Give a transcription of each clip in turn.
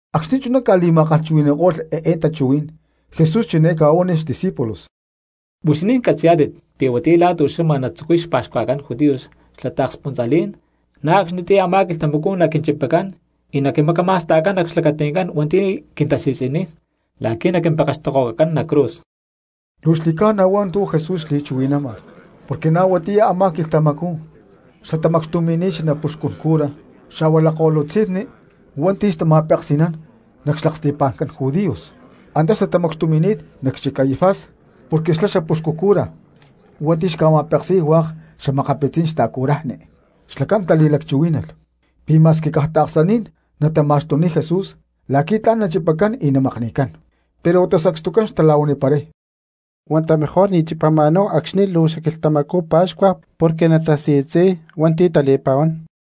Acxni̠ chuná ca̠li̠ma̠kalhchuhui̠ni̠ko̠lh eé tachuhuí̠n Jesús chiné ca̠huánilh xdiscípulos: —Huixinín catzi̠yá̠tit pi̠ huatiyá la̠ tu̠xama natzucuy xpa̠xcuajcán judíos xla taakspuntza̠lí̠n, na̠ acxnitiyá a̠má quilhtamacú naquinchipacán y naquimacama̠sta̠cán nac xlacati̠ncán hua̠nti̠ quintasi̠tzi̠niy la̠qui̠ naquimpekextokohuacacán nac cruz. Luu xli̠ca̠na hua̠ntu̠ Jesús xli̠chuhui̠nama porque na̠ huatiyá a̠má quilhtamacú xtatamacxtumi̠ni̠t xanapuxcun cura xa̠hua lakko̠lutzi̠nni hua̠nti̠ xtama̠peksi̠nán nac xlaksti̠pa̠ncán judíos, antá xtatamacxtumi̠ni̠t nac xchic Caifás porque xlá xapuxcu cura hua̠nti̠ xca̠ma̠peksi̠y hua̠k xa̠makapitzí̠n xta̠curajni. Xlacán tali̠lacchuhuí̠nalh pi̠ ma̠squi caj taaksaní̠n natama̠xtuniy Jesús la̠qui̠ tla̠n nachipacán y namakni̠cán. Pero huata sacstucán xtala̠huaniparay: —Huata mejor ni̠ chipama̠náhu acxni̠ luu xquilhtamacú pa̠xcua porque natasi̠tzi̠y hua̠nti̠ tali̠pa̠huán.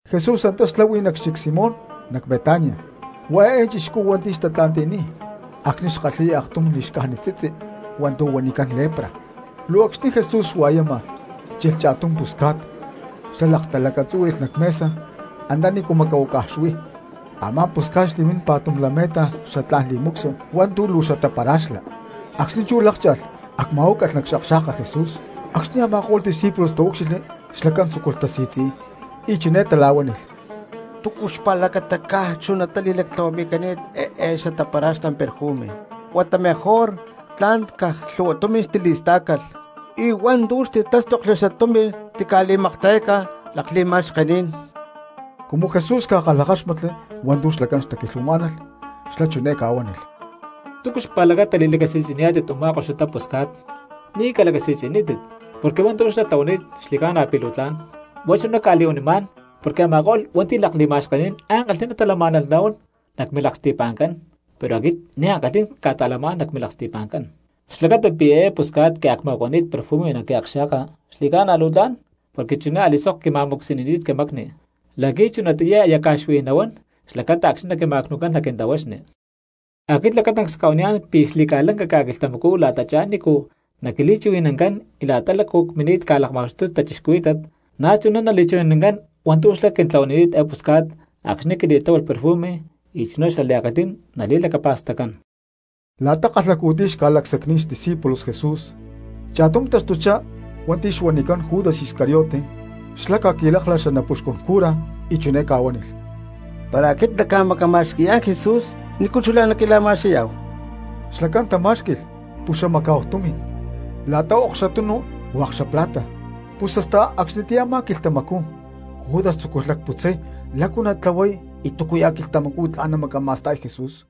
Jesús antá xláhui nac xchic Simón nac Betania, huá eé chixcú hua̠nti̠ tatla̠nti̠ni̠t acxni̠ xkalhi̠y aktum li̠xcájnit tzitzi hua̠ntu̠ huanicán lepra. Luu acxni̠ Jesús xua̠yama chilh cha̠tum pusca̠t xlá laktalacatzúhui̠lh nac mesa antanícu macahuácaj xuí; a̠má pusca̠t xli̠mini̠t pa̠tum lame̠ta xatlá̠n perfume hua̠ntu̠ luu xatapara̠xlá. Acxni̠ chú lákcha̠lh acma̠huácalh nac xakxa̠ka Jesús. Acxni̠ a̠ma̠ko̠lh discípulos taúcxilhli xlacán tzúculh tasi̠tzi̠y y chiné tala̠huánilh: —¿Túcu xpa̠lacata caj luu chunatá li̠lactlahuami̠cani̠t eé xatapara̠xlá perfume? Huata mejor tla̠n caj luu lhu̠hua tumi̠n xtili̠stá̠calh, y hua̠ntu̠ xtitástokli xatumi̠n xtica̠li̠makta̠yácalh lakli̠ma̠xkení̠n. Cumu Jesús ca̠kalhakáxmatli hua̠ntu̠ xlacán xtaquilhuamá̠nalh xlá chiné ca̠huánilh: —¿Túcu xpa̠lacata li̠lacasi̠tzi̠nipá̠tit u̠má koxutá pusca̠t? Ni̠ calacasi̠tzi̠nítit, porque hua̠ntu̠ xlá tlahuani̠t xli̠ca̠na pi̠ luu tla̠n. Huá chuná cca̠li̠huanimá̠n porque a̠ma̠ko̠lh cristianos hua̠nti̠ lakli̠ma̠xkení̠n ankalhi̠ná talamá̠nalh nahuán nac milaksti̠pa̠ncán, pero aquit ni̠ ankalhí̠n cca̠ta̠lamá̠n nac milaksti̠pa̠ncán. Xlacata pi̠ eé pusca̠t quiacma̠huacani̠t perfume nac quiakxa̠ka xli̠ca̠na luu tlán, porque chuná a̠li̠sok quima̠mu̠csi̠nini̠t quimacni la̠qui̠ chunatiyá aya cca̠xui nahuán xlacata acxni̠ naquima̠cnu̠cán nac quintahuaxni. Aquit lacatancs cca̠huaniyá̠n pi̠ xli̠ca̠lanca ca̠quilhtamacú la̠tachá nícu naquili̠chuhui̠nancán y la̠ta lácu cmini̠t ca̠lakma̠xtuy cristianos, na̠ chuná nali̠chuhui̠nancán hua̠ntu̠ xlá quintlahuanini̠t eé pusca̠t acxni̠ quili̠tláhualh perfume y chuná xliankalhí̠n nali̠lacapa̠staccán. La̠ta kalhacu̠tiy xca̠lacsacni̠t xdiscípulos Jesús, cha̠tum taxtuchá hua̠nti̠ xuanicán Judas Iscariote, xlá ca̠qui̠láklalh xanapuxcún cura y chiné ca̠huánilh: —Para aquit nacca̠macama̠xqui̠yá̠n Jesús, ¿nícu chulá naquila̠ma̠skahui̠yá̠hu? Xlacán tamá̠xqui̠lh puxamacá̠hu tumi̠n la̠ta xaokxutunu hua̠k xla plata, pus hasta acxnitiyá a̠má quilhtamacú Judas tzúculh lacputzay lácu natlahuay y túcuya̠ quilhtamacú tla̠n namacama̠sta̠y Jesús.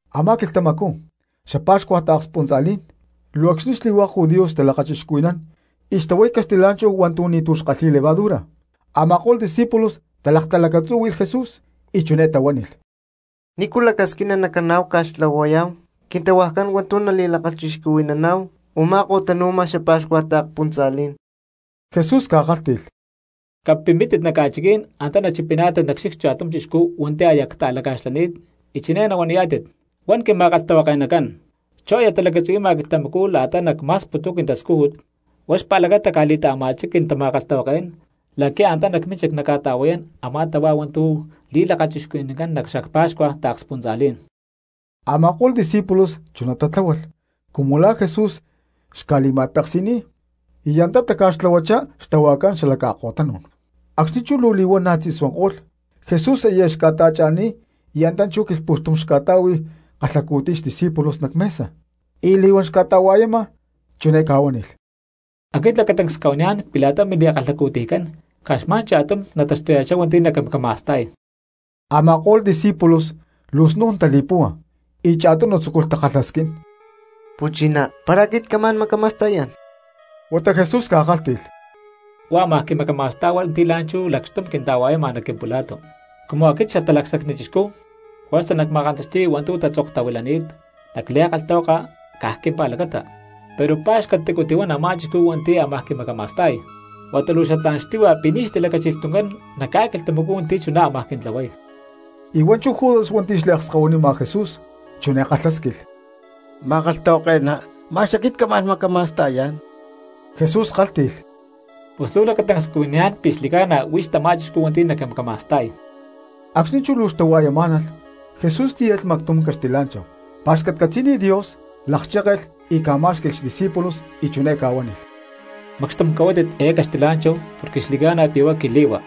Amá quilhtamacú xapa̠xcua taakspuntza̠lí̠n luu acxni̠ xli̠hua̠k judíos xtalakachixcuhui̠nán y xtahuay caxtilá̠nchahu hua̠ntu̠ ni̠tu̠ kalhi̠y levadura, a̠ma̠ko̠lh discípulos talaktalacatzúhui̠lh Jesús y chiné tahuánilh: —¿Nícu lacasquina nacaná̠hu ca̠xtlahuayá̠hu quintahuajcán hua̠ntu̠ nali̠lakachixcuhui̠naná̠hu u̠má ko̠tanu̠ma xapa̠xcua taakspuntza̠lí̠n? Jesús ca̠kálhti̠lh: —Capimpítit nac ca̠chiquí̠n antá nachipiná̠tit nac xchic cha̠tum chixcú hua̠nti̠ aquit aya cta̠laca̠xlani̠t y chiné nahuaniyá̠tit: “Huán quima̠kalhtahuake̠nacán: Chú aya talacatzuhui̠ma quilhtamacú la̠ta nacma̠sputuy quintascújut, huá xpa̠lacata cca̠li̠ta̠ama̠chá quintama̠kalhtahuaké̠n la̠qui̠ antá nac mínchic nacca̠ta̠hua̠yán a̠má tahuá hua̠ntu̠ li̠lakachixcuhui̠nancán nac xapa̠xcua taakspuntza̠lí̠n.” Ama̠ko̠lh discípulos chuná tatláhualh cumu la̠ Jesús xca̠li̠ma̠peksi̠ni̠t y antá taca̠xtlahuachá xtahuajcán xala ca̠ko̠tanú̠n. Acxni̠ chú luu li̠huana̠ tzi̠suanko̠lh, Jesús aya xca̠ta̠cha̠ni̠t y antá chú quilhpu̠xtum xca̠ta̠hui kalhacu̠tiy xdiscípulos nac mesa. Y li̠huán xca̠ta̠hua̠yama chiné ca̠huánilh: —Aquit lacatancs cca̠huaniyá̠n pi̠ la̠ta mili̠kalhacu̠tiycán caj xma̠n cha̠tum nataxtuya̠chá hua̠nti̠ naquimacama̠sta̠y. Ama̠ko̠lh discípulos luu snu̠n tali̠púhua y cha̠tunu tzúculh takalhasquín: —Quimpu̠chinacán, ¿para aquit camá̠n macama̠sta̠yá̠n? Huata Jesús ca̠kálhti̠lh: —Huá ámaj quimacama̠sta̠y hua̠nti̠ la̠nchú lacxtum quinta̠hua̠yama nac quimpula̠tu. Cumu aquit Xatalacsacni Chixcú juerza nacma̠kantaxti̠y hua̠ntu̠ tatzoktahuilani̠t nac li̠kalhtahuaka caj quimpa̠lacata; pero ¡pa̠xcatacu tihuán a̠má chixcú hua̠nti̠ ámaj quimacama̠sta̠y! Huata luu xatlá̠n xtíhua pi̠ ni̠ xtilacáchilh tuncán nac ca̠quilhtamacú hua̠nti̠ chuná ámaj quintlahuay. Y hua̠nchú Judas hua̠nti̠ xliakskahuinima Jesús chiné kalhásquilh: —Ma̠kalhtahuake̠ná, ¿ma̠x aquit camá̠n macama̠sta̠yá̠n? Jesús kálhti̠lh: —Pus luu lacatancs cuaniyá̠n pi̠ xli̠ca̠na huix tamá chixcú hua̠nti̠ naquimacama̠sta̠y. Acxni̠ chú luu xtahua̠yamá̠nalh, Jesús tíyalh mactum caxtilá̠nchahu, pa̠xcatcatzí̠nilh Dios, lakchékelh y ca̠má̠xqui̠lh xdiscípulos y chiné ca̠huánilh: —Macxtum cahuátit eé caxtilá̠nchahu porque xli̠ca̠na pi̠ huá quili̠hua.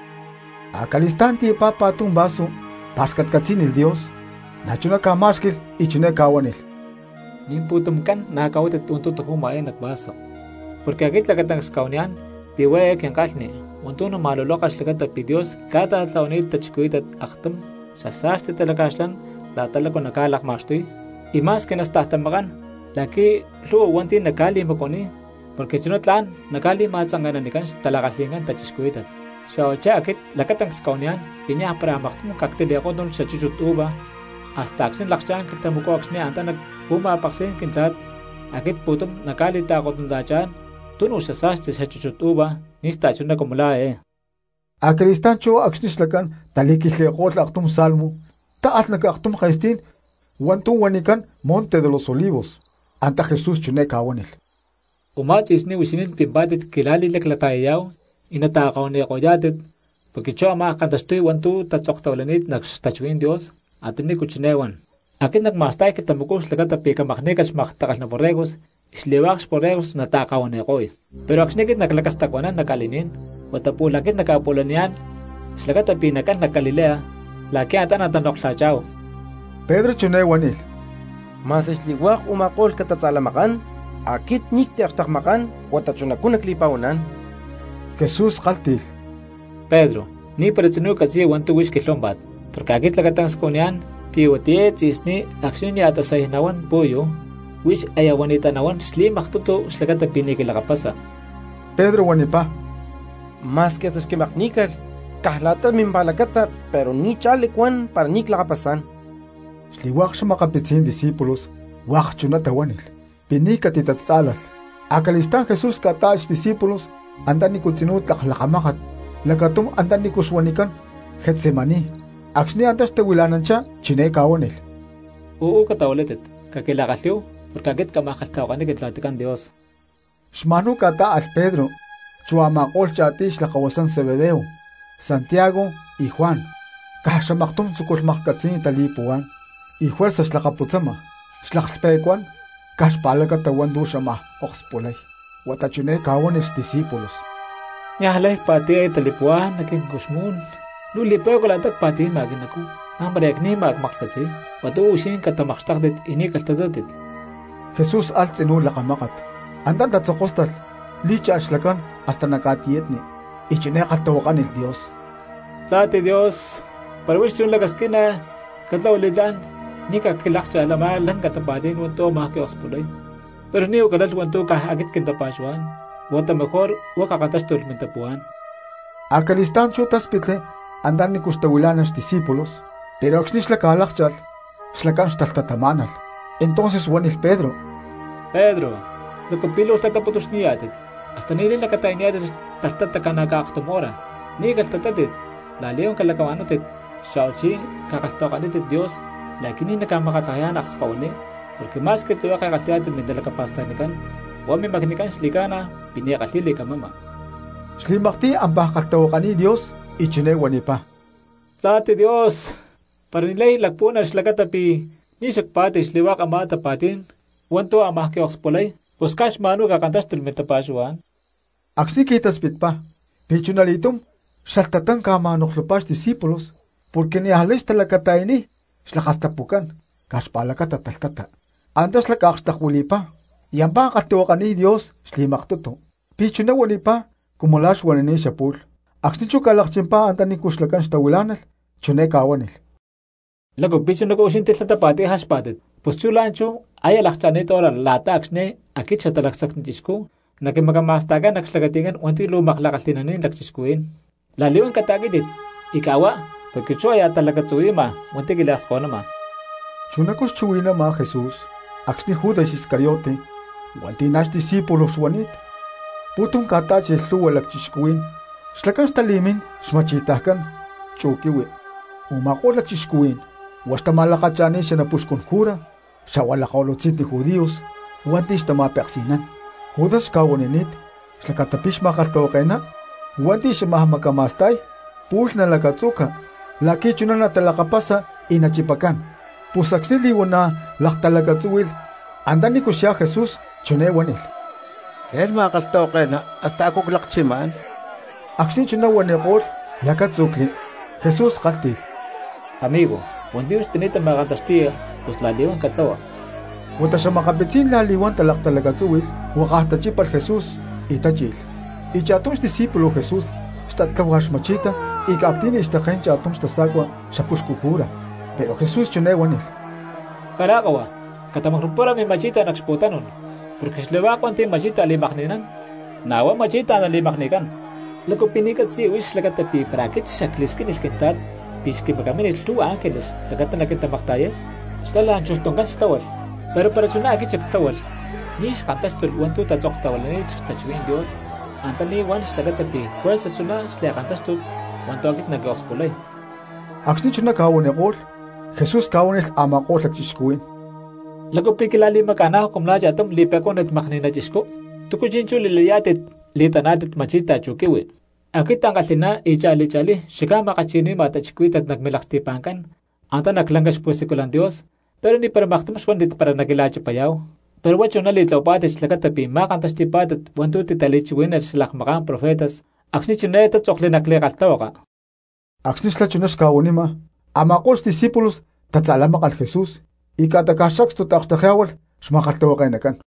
Acali̠stá̠n tiyapá pa̠tum vaso, pa̠xcatcatzí̠nilh Dios, na̠chuná ca̠má̠xqui̠lh y chiné ca̠huánilh: —Mimpu̠tumcán na̠ cahuátit hua̠ntu̠ taju̠ma nac eé vaso. Porque aquit lacatancs cca̠huaniyá̠n pi̠ huá eé quinkalhni hua̠ntu̠ nama̠luloka xlacata pi̠ Dios ca̠ta̠tlahuani̠t cristianos aktum xasa̠sti talaca̠xlán la̠ta lácu naca̠lakma̠xtuy, y ma̠squi nastajtamakán la̠qui̠ lhu̠hua hua̠nti̠ naca̠li̠macuaniy porque chuná tla̠n naca̠li̠ma̠tzanke̠nanicán xtala̠kalhi̠ncán cristianos. Xa̠huachí aquit lacatancs cca̠huaniyá̠n pi̠ niaj para maktum cactili̠kótnulh xchúchut uva, hasta acxni̠ nalakchá̠n quilhtamacú acxni̠ antá nac xpu̠ma̠peksí̠n Quintla̠t aquit pu̠tum nacca̠ta̠li̠kotnuna̠chá̠n tunu xasa̠sti xchúchut uva ni̠ xta̠chuná cumu la̠ eé. Acali̠stá̠n chú acxni̠ xlacán tali̠quilhtli̠ko̠lh aktum salmo táalh nac aktum ke̠stí̠n hua̠ntu̠ huanicán Monte de los Olivos. Antá Jesús chiné ca̠huánilh: —Umá tzi̠sní huixinín pimpá̠tit quila̠li̠laclata̠yayá̠hu y nata̠kahuani̠ko̠yá̠tit, porque chú amaj kantaxtuy hua̠ntu̠ tatzoktahuilani̠t nac xtachuhuí̠n Dios antanícu chiné huán: “Aquit nacma̠sta̠y quilhtamacú xlacata pi̠ camakní̠calh xmaktakalhná borregos y xli̠hua̠k xborregos nataakahuani̠ko̠y.” Pero acxni̠ aquit naclacastacuanán nac ca̠li̠ní̠n huata pu̠lh aquit nacca̠pu̠laniyá̠n xlacata pi̠ nacán nac Galilea la̠qui̠ antá natanoklha̠chá̠hu. Pedro chiné huánilh: —Ma̠squi xli̠hua̠k u̠ma̠ko̠lh catatza̠lamakán, aquit ni̠ cactiakxtekmakán huata chunacú nacli̠pa̠huaná̠n. Jesús kálhti̠lh: —Pedro, ni̠para tzinú catzi̠ya hua̠ntu̠ huix quilhuámpa̠t, porque aquit lacatancs cuaniyá̠n pi̠ huatiyá eé tzi̠sní acxni̠ nia̠ tasay nahuán pu̠yu, huix aya huani̠tatá nahuán xli̠maktutu xlacata pi̠ ni̠ quilakapasa. Pedro huanipá: —Ma̠squi hasta xquili̠makní̠calh caj la̠ta mimpa̠lacata pero ni̠ cha̠lí cuán para ni̠ clakapasá̠n. Xli̠hua̠k xa̠makapitzí̠n discípulos hua̠k chuná tahuánilh pi̠ ni̠ catitatzá̠lalh. Acali̠stá̠n Jesús ca̠tá̠alh xdiscípulos anta nícu tzinú tlak lakamákat lacatum antanícu xuanicán Getsemaní. Acxni̠ antá xtahuila̠nanchá chiné ca̠huánilh: —Uú catahuilátit, caquila̠kalhí̠hu, porque aquit camaj kalhtahuakaniy Quintla̠ticán Dios. Xma̠nhuá ca̠tá̠alh Pedro chu a̠ma̠ko̠lh cha̠tiy xlakahuasán Zebedeo, Santiago y Juan. Caj xamaktum tzúculh maklhcatzi̠y tali̠puhuá̠n y juerza xlakapútzama xlaklhpe̠cuán caj xpa̠lacata hua̠ntu̠ xamaj akspulay. Huata chiné ca̠huánilh xdiscípulos: —Niajlay cpa̠ti̠y eé tali̠puhuá̠n nac quincuxmú̠n, luu li̠pe̠cua la̠ta pa̠ti̠ma quinacú; la̠mpara aya cni̠ma cmaklhcatzi̠y. Huata uú huixinín catamakxtéktit y ni̠ calhtatátit. Jesús alh tzinú lakamákat, antá tatzokóstalh lí̠cha̠lh xlacán hasta nac ca̠tiyatni y chiné kalhtahuakánilh Dios: —Papá Dios, para huix chuná lacasquina, catlahua li̠tlá̠n ni̠ xquilákcha̠lh a̠má lanca tapa̠tí̠n hua̠ntu̠ ámaj quiokspulay. Pero ni̠huá calalh hua̠ntu̠ caj aquit quintapa̠xuhuá̠n, huata mejor huá cakantáxtulh mintapuhuá̠n. Acali̠stá̠n chú táspitli antanícu xtahuilá̠nalh xdiscípulos, pero acxni̠ xlá ca̠lákcha̠lh xlacán xtalhtatamá̠nalh. Entonces huánilh Pedro: —¡Pedro! ¿Lácu pi̠ luu lhtataputuxni̠yá̠tit? ¿Hasta ni̠lay lacata̠yanítit talhtata ca̠na̠caj aktum hora? Ni̠ calhtatátit, la̠li̠huán calacahua̠nántit xa̠huachí cakalhtahuakanítit Dios la̠qui̠ ni̠ naca̠makatlajayá̠n akskahuiní. Porque ma̠squi tlihueke kalhi̠yá̠tit mintalacapa̠stacni, huá mimacnicán xli̠ca̠na pi̠ ni̠ kalhi̠y li̠camama. Xli̠maktiy ampá kalhtahuakaniy Dios, y chiné huanipá: —Papá Dios, para ni̠lay lacpuhuana xlacata pi̠ ni̠ xacpá̠ti̠lh xli̠hua̠k amá tapa̠tí̠n hua̠ntu̠ ámaj quiokspulay, pus caj xma̠nhuá cakantáxtulh mintapa̠xuhuá̠n. Acxni̠ qui̠taspitpá, pi̠ chunali̠túm xalhtatán ca̠ma̠noklhupá xdiscípulos porque niajlay xtalacata̠yaniy xlakastapucán caj xpa̠lacata talhtata. Antá xlá ca̠akxtekuili̠pá y ampá kalhtahuakaniy Dios xli̠maktutu, pi̠ chuná huanipá cumu la̠ xuanini̠t xapu̠lh. Acxni̠ chú ca̠lakchimpá antanícu xlacán xtahuilá̠nalh chiné ca̠huánilh: —¿Lácu pi̠ chunacú huixinín tilhtatapá̠tit y jaxpá̠tit? Pus chú la̠nchú aya lakcha̠ni̠t hora la̠ta acxni̠ aquit Xatalacsacni Chixcú naquimacama̠sta̠cán nac xlacati̠ncán hua̠nti̠ luu makla̠kalhi̠naní̠n lacchixcuhuí̠n. La̠li̠huán cata̠quí̠tit y ca̠huá porque chú aya talacatzuhui̠ma hua̠nti̠ quiliakskahuinima. Chunacú xchuhui̠nama Jesús acxni̠ Judas Iscariote hua̠nti̠ na̠ xdiscípulo xuani̠t, pu̠tum ca̠tá̠chilh lhu̠hua lacchixcuhuí̠n xlacán xtali̠mín xma̠chi̠tajcán chu quihui, u̠ma̠ko̠lh lacchixcuhuí̠n huá xtama̠lakacha̠ni̠t xanapuxcún cura xa̠hua lakko̠lutzi̠nni Judíos hua̠nti̠ xtama̠peksi̠nán. Judas xca̠huanini̠t xlacata pi̠ xma̠kalhtahuake̠ná hua̠nti̠ xamaj macama̠sta̠y pu̠lh nalacatzu̠ca la̠qui̠ chuná natalakapasa y nachipacán. Pus acxni̠ li̠huana̠ laktalacatzúhui̠lh antanícu xyá Jesús chiné huánilh: —¡Tlé̠n, ma̠kalhtahuake̠ná, hasta a̠cu clakchimá̠n! Acxni̠ chuná huaniko̠lh lacátzu̠cli. Jesús kálhti̠lh: —Amigo, hua̠ntu̠ huix tani̠ta ma̠kantaxti̠ya, pus la̠li̠huán catlahua. Huata xa̠makapitzí̠n la̠li̠huán talaktalacatzúhui̠lh, huakaj tachípalh Jesús y tachi̠lh. Y cha̠tum xdiscípulo Jesús xtat tláhualh xma̠chi̠ta y ca̠ctí̠nilh xtaké̠n cha̠tum xtasa̠cua xapuxcu cura. Pero Jesús chiné huánilh: —Cará kahuasa, catamacnu̠para mima̠chi̠ta nac xpu̠tanú̠n, porque xli̠hua̠k hua̠nti̠ ma̠chi̠ta li̠makni̠nán, na̠ huá ma̠chi̠ta nali̠makni̠cán. ¿Lácu pi̠ ni̠ catzi̠ya huix xlacata pi̠ para aquit xacli̠squínilh Quintla̠t pi̠ xquimacamínilh lhu̠hua ángeles xlacata naquintamakta̠yay, xlá la̠nchujtuncán xtláhualh? Pero para chuná aquit xactláhualh ni̠ xkantáxtulh hua̠ntu̠ tatzoktahuilani̠t xtachuhuí̠n Dios antaní huán xlacata pi̠ juerza chuná xli̠kantáxtut hua̠ntu̠ aquit naquiokspulay. Acxni̠ chuná ca̠huaniko̠lh, Jesús ca̠huánilh a̠ma̠ko̠lh lacchixcuhuí̠n: —¿Lácu pi̠ quila̠li̠maca̠ná̠hu cumu la̠ cha̠tum li̠pe̠cuánit makni̠na chixcú? ¿Túcu chi̠nchú li̠layá̠tit li̠taná̠tit ma̠chi̠ta chu quihui? Aquit ankalhi̠ná y cha̠li cha̠lí xacca̠ma̠kalhchuhui̠ni̠ma cristianos nac milaksti̠pa̠ncán antá nac lanca xpu̠siculan Dios, pero ni̠para maktum xuántit para naquila̠chipayá̠hu. Pero huá chuná li̠tlahuapá̠tit xlacata pi̠ ma̠kantaxti̠pá̠tit hua̠ntu̠ titali̠chuhuí̠nalh xalakmaká̠n profetas acxni̠ chiné tátzokli nac li̠kalhtahuaka. Acxni̠ xlá chuná xca̠huanima, a̠ma̠ko̠lh xdiscípulos tatza̠lamákalh Jesús y ca̠ta caj sacstu taakxtekyá̠hualh xma̠kalhtahuake̠nacán.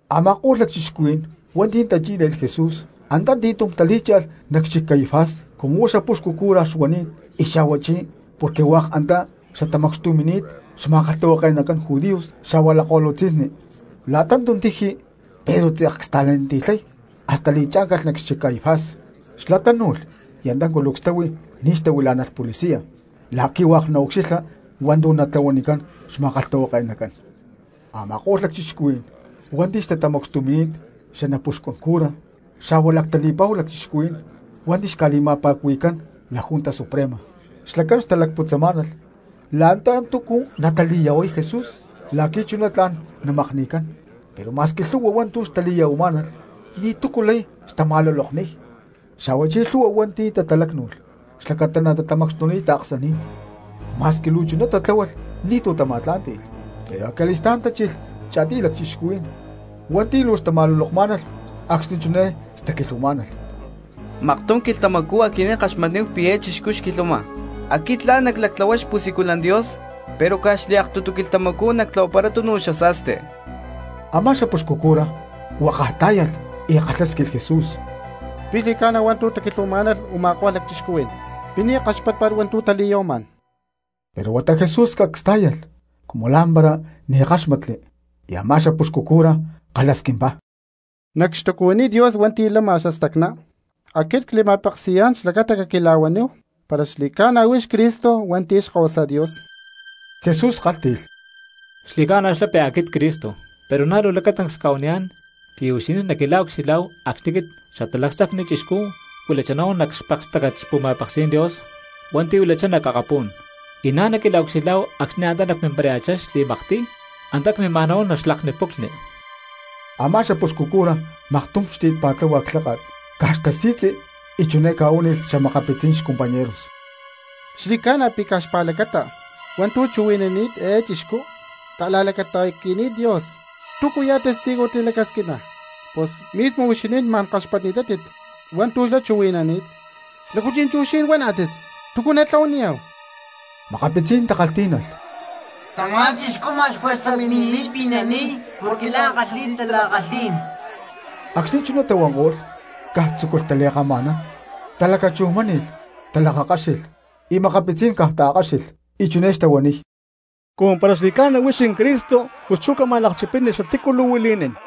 Ama̠ko̠lh lacchixcuhuí̠n hua̠nti̠ tachí̠le̠lh Jesús antati̠túm talí̠cha̠lh nac xchic Caifás cumu huá xapuxcu cura xuani̠t y xa̠huachí porque hua̠k antá xtatamacxtumi̠ni̠t xma̠kalhtahuake̠nacán judíos xa̠hua lakko̠lutzi̠nni. La̠ta tuntiji Pedro tze̠k csta̠laniti̠lhani̠t hasta li̠chá̠ncalh nac xchic Caifás. Xlá tánu̠lh y antá culucs táhui ní xtahuilá̠nalh policías la̠qui̠ hua̠k naucxilha hua̠ntu̠ natlahuanicán xma̠kalhtahuake̠nacán. Ama̠ko̠lh lacchixcuhuí̠n hua̠nti̠ xtatamacxtumi̠ni̠t xanapuxcun cura xa̠hua lactali̠pa̠hu lacchixcuhuí̠n hua̠nti̠ xca̠li̠ma̠pa̠cuhui̠cán La Junta Suprema, xlacán xtalacputzamá̠nalh la̠ta túcu natali̠ya̠huay Jesús la̠qui̠ chuná tla̠n namakni̠cán. Pero ma̠squi lhu̠hua hua̠ntu̠ xtali̠ya̠huamá̠nalh ni̠tu̠cu lay xtama̠lulokniy, xa̠huachí lhu̠hua hua̠nti̠ tatalácnu̠lh xlacata natama̠xtuniy taaksaní̠n, ma̠squi luu chuná tatláhualh ni̠tu̠ tama̠tlá̠nti̠lh. Pero acali̠stá̠n tachilh cha̠tiy lacchixcuhuí̠n hua̠nti̠ luu xtama̠lulokmá̠nalh acxni̠ chiné xtaquilhuamá̠nalh: —¡Maktum quilhtamacú aquinín ckaxmatni̠táhu pi̠ eé chixcú xquilhuama: “Aquit tla̠n naclactlahuay xpu̠siculan Dios pero caj xliaktutu quilhtamacú nactlahuaparay tunu xasa̠sti”! Amá xapuxcu cura huakaj tá̠yalh y kalhásquilh Jesús: —¿Pi̠ xli̠ca̠na hua̠ntu̠ taquilhuamá̠nalh u̠ma̠ko̠lh lacchixcuhuí̠n? ¿Pi̠ ni̠ kaxpátpa̠t hua̠ntu̠ tali̠ya̠huamá̠n? Pero huata Jesús cacs tá̠yalh cumu la̠mpara ni̠ káxmatli, y amá xapuxcu cura kalhasquimpá: —Nac xtacuhuiní Dios hua̠nti̠ lama xastacná, aquit cli̠ma̠peksi̠yá̠n xlacata caquila̠huaníhu para xli̠ca̠na huix Cristo hua̠nti̠ Xkahuasa Dios. Jesús kálhti̠lh: —Xli̠ca̠na xlá pi̠ aquit Cristo, pero na̠ luu lacatancs cca̠huaniyá̠n pi̠ huixinín naquila̠ucxilhá̠hu acxni̠ aquit Xatalacsacni Chixcú cuilachá nahuán nac xpekstácat xpu̠ma̠peksí̠n Dios hua̠nti̠ huilachá nac akapu̠n, y na̠ naquila̠ucxilhá̠hu acxni̠ antá nacmimparaya̠chá xli̠maktiy antá cmímaj nahuán nac xlacni puclhni. Amá xapuxcu cura maktum xti̠t pa̠tláhualh clháka̠t caj xtasi̠tzi y chiné ca̠huánilh xa̠makapitzí̠n xcompañeros: —Xli̠ca̠na pi̠ caj xpa̠lacata hua̠ntu̠ chuhui̠nani̠t eé chixcú ta̠la̠lacata̠qui̠ni̠t Dios, ¿túcuya̠ testigo tilacasquiná̠hu? Pus mismo huixinín ma̠n kaxpatni̠tátit hua̠ntu̠ xlá chuhui̠nani̠t. ¿Lácu chi̠nchú huixinín huaná̠tit? ¿Túcu natlahuaniyá̠hu? Makapitzí̠n takalhtí̠nalh: —Tamá chixcú ma̠x juerza mini̠niy pi̠ nani̠y porque la̠n kalhi̠y xtala̠kalhí̠n. Acxni̠ chuná tahuanko̠lh caj tzúculh tali̠kama̠nán, talacachujmáni̠lh, talakakáxilh, y makapitzí̠n caj taakkáxilh. Y chiné xtahuaniy: —Cumu para xli̠ca̠na huix Cristo, pus chú cama̠lakchipini xatícu luu huili̠nín.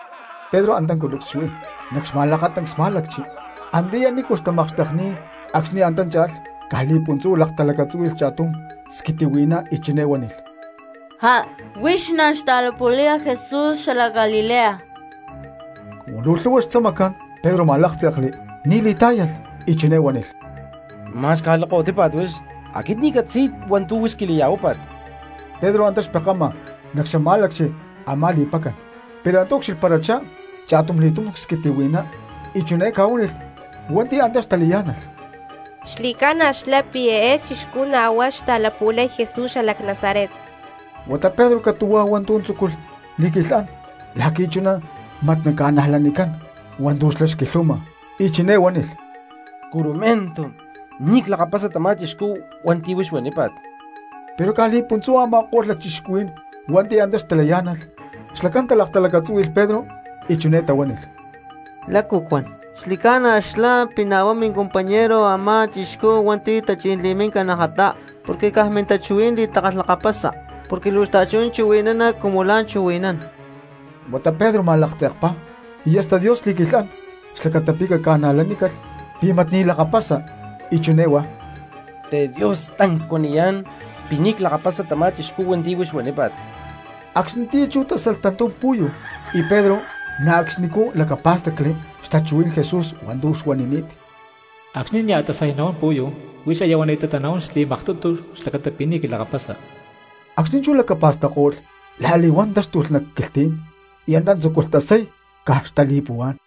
Pedro antá culucs xuí nac xma̠lakatancs má̠lacchi antiyá nícu xtamakxtekni̠t acxni̠ antá cha̠lh, caj li̠puntzú laktalacatzúhui̠lh cha̠tum squitihui̠ná y chiné huánilh: —¡Já! Huix na̠ xta̠lapu̠laya Jesús xalac Galilea. Cumu luu lhu̠hua xtzamacán Pedro ma̠láktze̠kli ni̠ li̠tá̠yalh, y chiné huánilh: —¡Ma̠x caj lakahuitípa̠t huix! Aquit ni̠ ccatzi̠y hua̠ntu̠ huix quili̠ya̠huápa̠t. Pedro antá xpekama nac xamá̠lacchi a̠má li̠pacan, pero antá ucxilhparachá cha̠tumli̠túm squitihui̠ná y chiné ca̠huánilh hua̠nti̠ antá xtalayá̠nalh: —Xli̠ca̠na xlá pi̠ eé chixcú na̠ huá xta̠lapu̠lay Jesús xalac Nazaret. Huata Pedro catu̠huá hua̠ntu̠ tzúculh li̠quilhán la̠qui̠ chuná mat naca̠najlanicán hua̠ntu̠ xlá xquilhuama y chiné huánilh: —¡Curumentu, ni̠ clakapasa tamá chixcú hua̠nti̠ huix huanípa̠t! Pero caj li̠puntzú a̠ma̠ko̠lh lacchixcuhuí̠n hua̠nti̠ antá xtalayá̠nalh xlacán talaktalacatzúhui̠lh Pedro y chiné tahuánilh: —¿Lácu cuán? Xli̠ca̠na xlá pi̠ na̠ huá mincompañero a̠má chixcú hua̠nti̠ tachí̠n li̠míncalh najatá, porque caj mintachuhuí̠n li̠takalhlakapasa porque luu xta̠chuná chuhui̠nana cumu la̠ chuhui̠nán xlá. Huata Pedro ma̠laktze̠kpá y hasta Dios xli̠quilhán xlacata pi̠ caca̠najlanícalh pi̠ mat ni̠ lakapasa y chiné huá: —¡TeDios, tancs cuaniyá̠n pi̠ ni̠ clakapasa tamá chixcú hua̠nti̠ huix huanípa̠t! Acxnitiyá chú tásalh tantum pu̠yu, y Pedro na̠ acxnicú lacapá̠stacli xtachuhuí̠n Jesús hua̠ntu̠ xuanini̠t: “Acxni̠ nia̠ tasay nahuán pu̠yu, huix aya huani̠tatá nahuán xli̠maktutu xlacata pi̠ ni̠ quilakapasa.” Acxni̠ chú lacapa̠stacko̠lh la̠li̠huán táxtulh nac quilhtí̠n y antá tzúculh tasay caj xtali̠puhuá̠n.